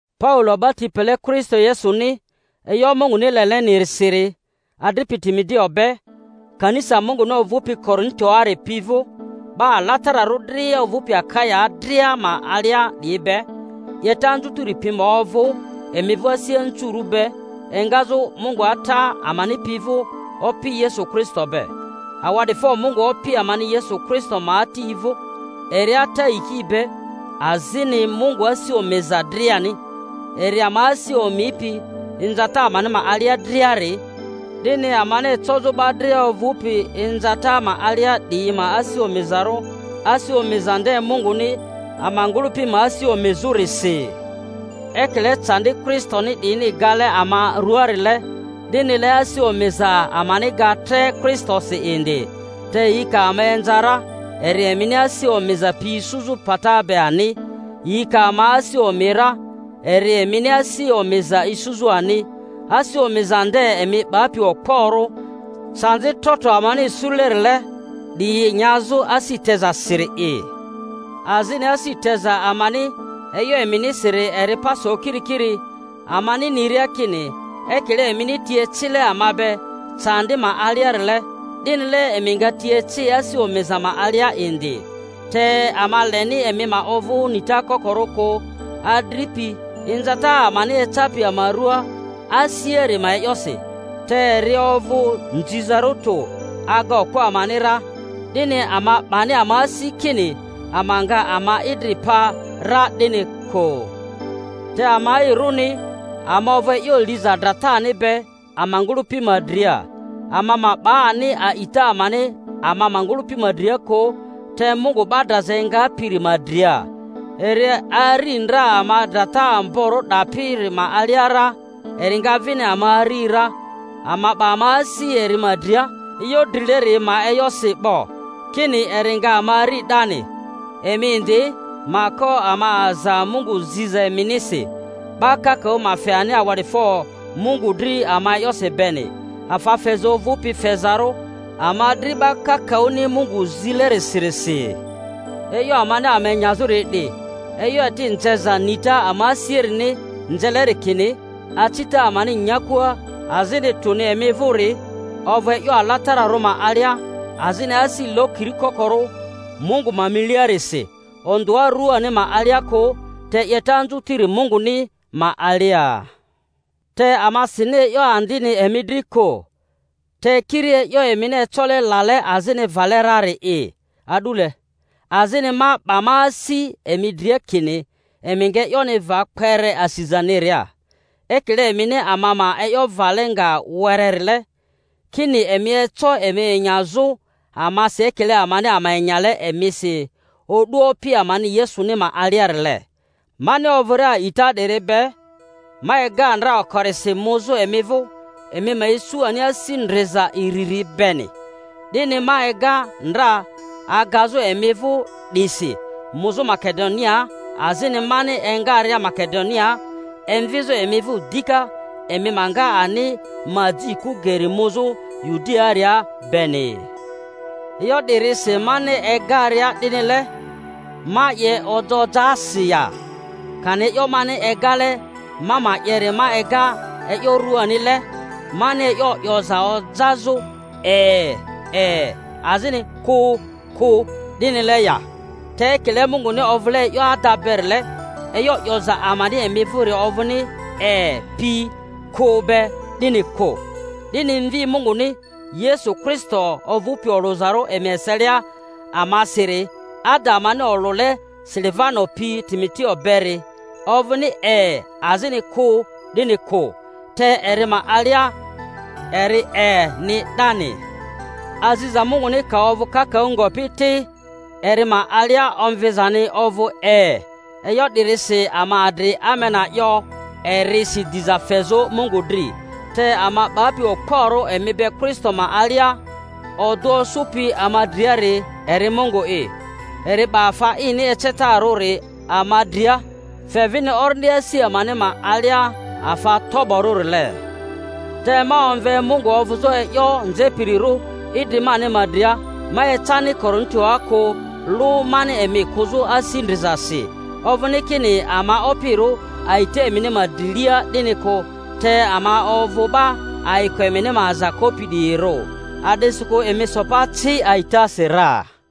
Paulo, 'ba ti pele Kristo Yesuni e'yo Munguni lelenirisiri, adripi Timoteo be, Kanisa Munguni ovᴜpi Korintoari pi vᴜ, 'ba alatararᴜ dria ovᴜpi Akaya dria ma alia 'diyi be: 'Yeta anzutiri pi ma ovᴜ emi vᴜ asi anzurᴜ be engazᴜ Mungu Ata amani pi vᴜ Opi Yesu Kristo be. Awa'difo Mungu Opi amani Yesu Kristo ma Ati vᴜ, eri Ata yiki be azini Mungu asi omiza driani; eri ama asi omipi inzata amani ma alia driari, 'dini amani ecozᴜ 'ba dria ovᴜpi inzata ma alia 'diyi ma asi omizarᴜ, asi omiza nde Munguni ama ngᴜlᴜpi ma asi omizᴜrisi. Ekile candi Kristoni 'diyini gale ama ruaarile, 'dinile asi omiza amani ga tre Kristosi indi. Te yi ka ama inza ra, eri emini asi omiza pi isuzᴜ pata be ani; yi ka ama asi omi ra, eri emini asi omiza isuzᴜ ani, asi omiza nde emi 'bapi okporᴜ candi trotro amani isulerile 'diyi nyazᴜ asi tezasiri'i. Azini asi teza amani e'yo eminisiri eri pa so kiri kiri; amani niria kini ekile emini ti ecile ama be candi ma aliarile, 'dinile emi nga ti eci asi omiza ma alia indi. Te ama leni emi ma ovᴜ nita kokorᴜ kᴜ, adripi, inzata amani ecapi ama rᴜaa Asiari ma e'yosi; te eri ovᴜ nzizarᴜ tᴜ, aga okpo amani ra, 'dini ama 'bani ama asi kini ama nga ama idri pa ra, 'dini kᴜ. Te ama'irᴜni, ama ovᴜ e'yo liza dratani be ama ngᴜlᴜpi ma dria, ama ma 'ba ani a'ita amani ama ma ngᴜlᴜpi ma dria kᴜ, te Mungu 'ba draza engapiri ma dria; eri ari ndra ama drata amborᴜ 'dapiri ma alia ra, eri nga vini ama ari ra; ama 'ba ama asi eri ma dria e'yo drileri ma e'yosi 'bo, kini eri nga ama ari 'dani. Emi indi ma ko ama aza Mungu ziza eminisi, 'ba kakaᴜ ma fe ani awa'difo Mungu dri ama ma e'yosi beni, afa feza ovᴜpi fezarᴜ ama dri 'ba kakaᴜni Mungu zilerisirisi. E'yo amani ama enyazᴜri 'di, e'yo eti nzeza nita ama asiarini nzeleri kini acita amani nyakua, azini tᴜni emi vᴜri, ovᴜ e'yo alatararᴜ ma alia azini asi lokiri kokorᴜ Mungu ma miliarisi, ondᴜa ruani ma alia kᴜ, te 'yeta anzutiri Munguni ma alia. Te ama sini e'yo andini emi dri kᴜ, te kiri e'yo emini ecole lale azini vale rari'i a'dule; azini ma 'ba ma asi emi dria kini emi nga e'yoni va kpere asizaniria, ekile emini ama ma e'yo vale nga wererile, kini emi eco emi enyazᴜ amasi ekile amani ama enyale emisi o'du Opi amani Yesuni ma aliarile. Mani ovᴜria a'ita 'diri be, ma ega ndra okorisi muzᴜ emi vᴜ emi ma isu ani asi ndriza iriri beni; 'dini ma ega ndra agazᴜ emi vᴜ 'disi muzᴜ Makedoniaa, azini mani engaria Makedoniaa emvizᴜ emi vᴜ dika, emi ma nga ani ma ji kᴜ geri muzᴜ Yudiaaria beni. E'yo 'dirisi mani egaria 'dinile, ma 'ye ojaojaasi ya? Kani e'yo mani egale ma ma 'yeri ma ega e'yo ruanile, mani e'yo 'yoza ojazᴜ E, e, azini Kᴜ, kᴜ, 'dinile ya? Te ekile Munguni ovᴜle e'yo ada berile, e'yo 'yoza amani emi vᴜri ovᴜni E pi Kᴜ be 'dini kᴜ. 'Dini Mvi Munguni, Yesu Kristo ovupi olᴜzarᴜ emi eselia amasiri, ada amani olᴜle Silivano pi Timoteo beri, ovᴜni E azini Kᴜ, 'dini kᴜ; te eri ma alia eri E-ni 'dani. Aziza Munguni ka ovᴜ kakaᴜ ngopi ti, eri ma alia omvizani ovᴜ E. E'yo 'dirisi ama adri Amena 'yo erisi diza fezᴜ Mungu dri. Te ama 'bapi okporᴜ emi be Kristo ma alia, odᴜ osᴜpi ama driari, eri Mungu'i; eri 'ba afa ini ecetarᴜri ama dria, fe vini Orindi asi amani ma alia afa toborᴜrile. Te ma omve Mungu ovᴜzᴜ e'yo nzepirirᴜ idri mani ma dria—ma ecani Korintoa kᴜ lᴜ mani emi kᴜzᴜ asi ndrizasi. Ovᴜni kini ama opirᴜ a'ita emini ma drilia, 'dini kᴜ, te ama ovᴜ 'ba ayiko emini ma aza kopi 'diyirᴜ, a'disikᴜ emi so pa ci a'itasi ra.